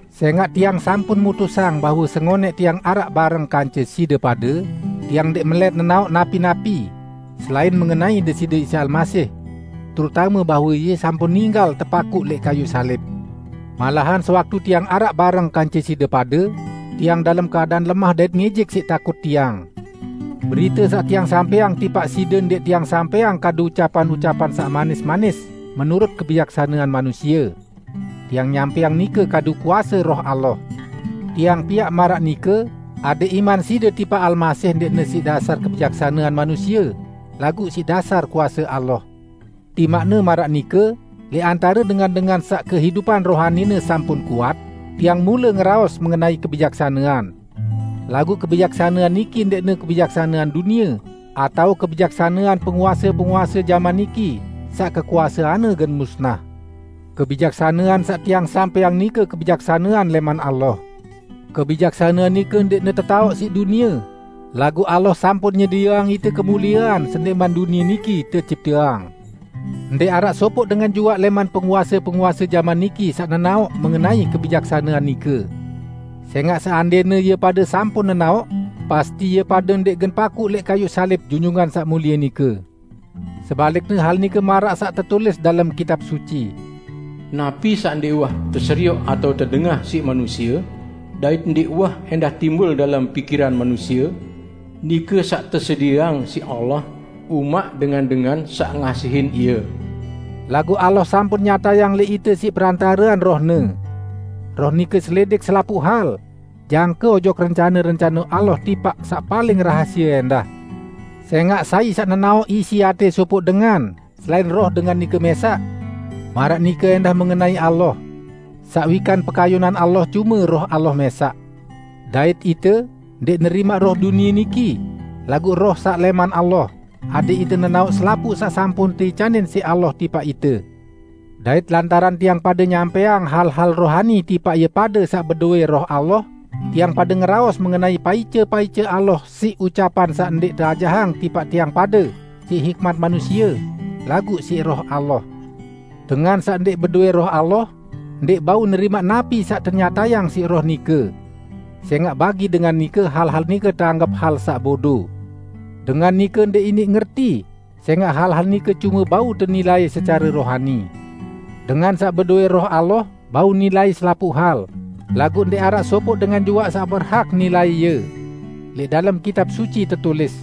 Sẽngaq tiang sampun mutusang bahwe sengonẽq tiang araq bareng kance side pade, tiang ndẽq melẽt nenaoq napi-napi, selain mengenai Deside Isa Almasih; terutame bahwe Ie sampun ninggal tepakuq lẽq kayuq salib. Malahan sewaktu tiang araq bareng kance side pade, tiang dalem keadaan lemah dait ngijik siq takut tiang. Berite saq tiang sampẽang tipaq side ndẽq tiang sampẽang kadu ucapan-ucapan saq manis-manis menurut kebijaksanean manusie. Tiang nyampẽang nike kadu kuase Roh Allah. Tiang piaq maraq nike, adẽq iman side tipaq Almasih ndẽqne siq dasar kebijaksanean manusie, laguq siq dasar kuase Allah. Timaqne maraq nike, lẽq antare dengan-dengan saq kehidupan rohanine sampun kuat, tiang mule ngeraos mengenai kebijaksanean. Laguq kebijaksanean niki ndẽqne kebijaksanean dunie, atao kebijaksanean penguase-penguase jaman niki, saq kekuaseanne gen musnah. Kebijaksanean saq tiang sampẽang nike kebijaksanean lẽman Allah. Kebijaksanean nike ndẽqne tetaoq siq dunie, laguq Allah sampun nyedieang ite kemuliean sendẽqman dunie niki tecipteang. Ndẽq araq sopoq dengan juaq lẽman penguase-penguase jaman niki saq nenaoq mengenai kebijaksanean nike. Sẽngaq, seandẽne ie pade sampun nenaoq, pasti ie pade ndẽq gen pakuq lẽq kayuq salib Junjungan Saq Mulie nike. Sebalikne hal nike maraq saq tetulis dalem Kitab Suci, "Napi saq ndẽq uwah teserioq atao tedengah siq manusie, dait ndẽq uwah ẽndah timbul dalem pikiran manusie, nike saq tesedieang siq Allah umaq dengan-dengan saq ngasihin Ie." Laguq Allah sampun nyatayang lẽq ite siq perantarean Roh-Ne. Roh nike selidik selapuq hal, jangke ojok rencane-rencane Allah timaq saq paling rahasie ẽndah. Sẽngaq sai saq nenaoq isi atẽ sopoq dengan, selain roh dengan nike mẽsaq? Maraq nike ẽndah mengenai Allah. Saq wikan pekayunan Allah cume Roh Allah mẽsaq! Dait ite, ndẽq nerimaq roh dunie niki, laguq Roh saq lẽman Allah, adẽq ite nenaoq selapuq saq sampun teicanin siq Allah tipaq ite. Dait lantaran tiang pade nyampẽang hal-hal rohani tipaq ie pade saq bedowẽ Roh Allah, tiang pade ngeraos mengenai paice-paice Allah siq ucapan saq ndẽq teajahang tipaq tiang pade siq hikmat manusie, laguq siq Roh Allah. Dengan saq ndẽq bedowẽ Roh Allah, ndẽq bau nerimaq napi saq tenyatayang siq Roh nike. Sẽngaq bagi dengan nike, hal-hal nike teanggep hal saq bodo. Dengan nike ndẽq iniq ngerti, sẽngaq hal-hal nike cume bau tenilai secare rohani. Dengan saq bedowẽ Roh Allah bau nilai selapuq hal, laguq ndẽq araq sopoq dengan juaq saq berhak nilai Ie. Lẽq dalem Kitab Suci tetulis,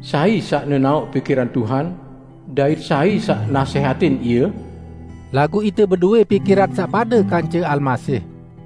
"Sai saq nenaoq pikiran Tuhan? Dait sai saq nasẽhatin Ie?" Laguq ite bedowẽ pikiran saq pade kance Almasih!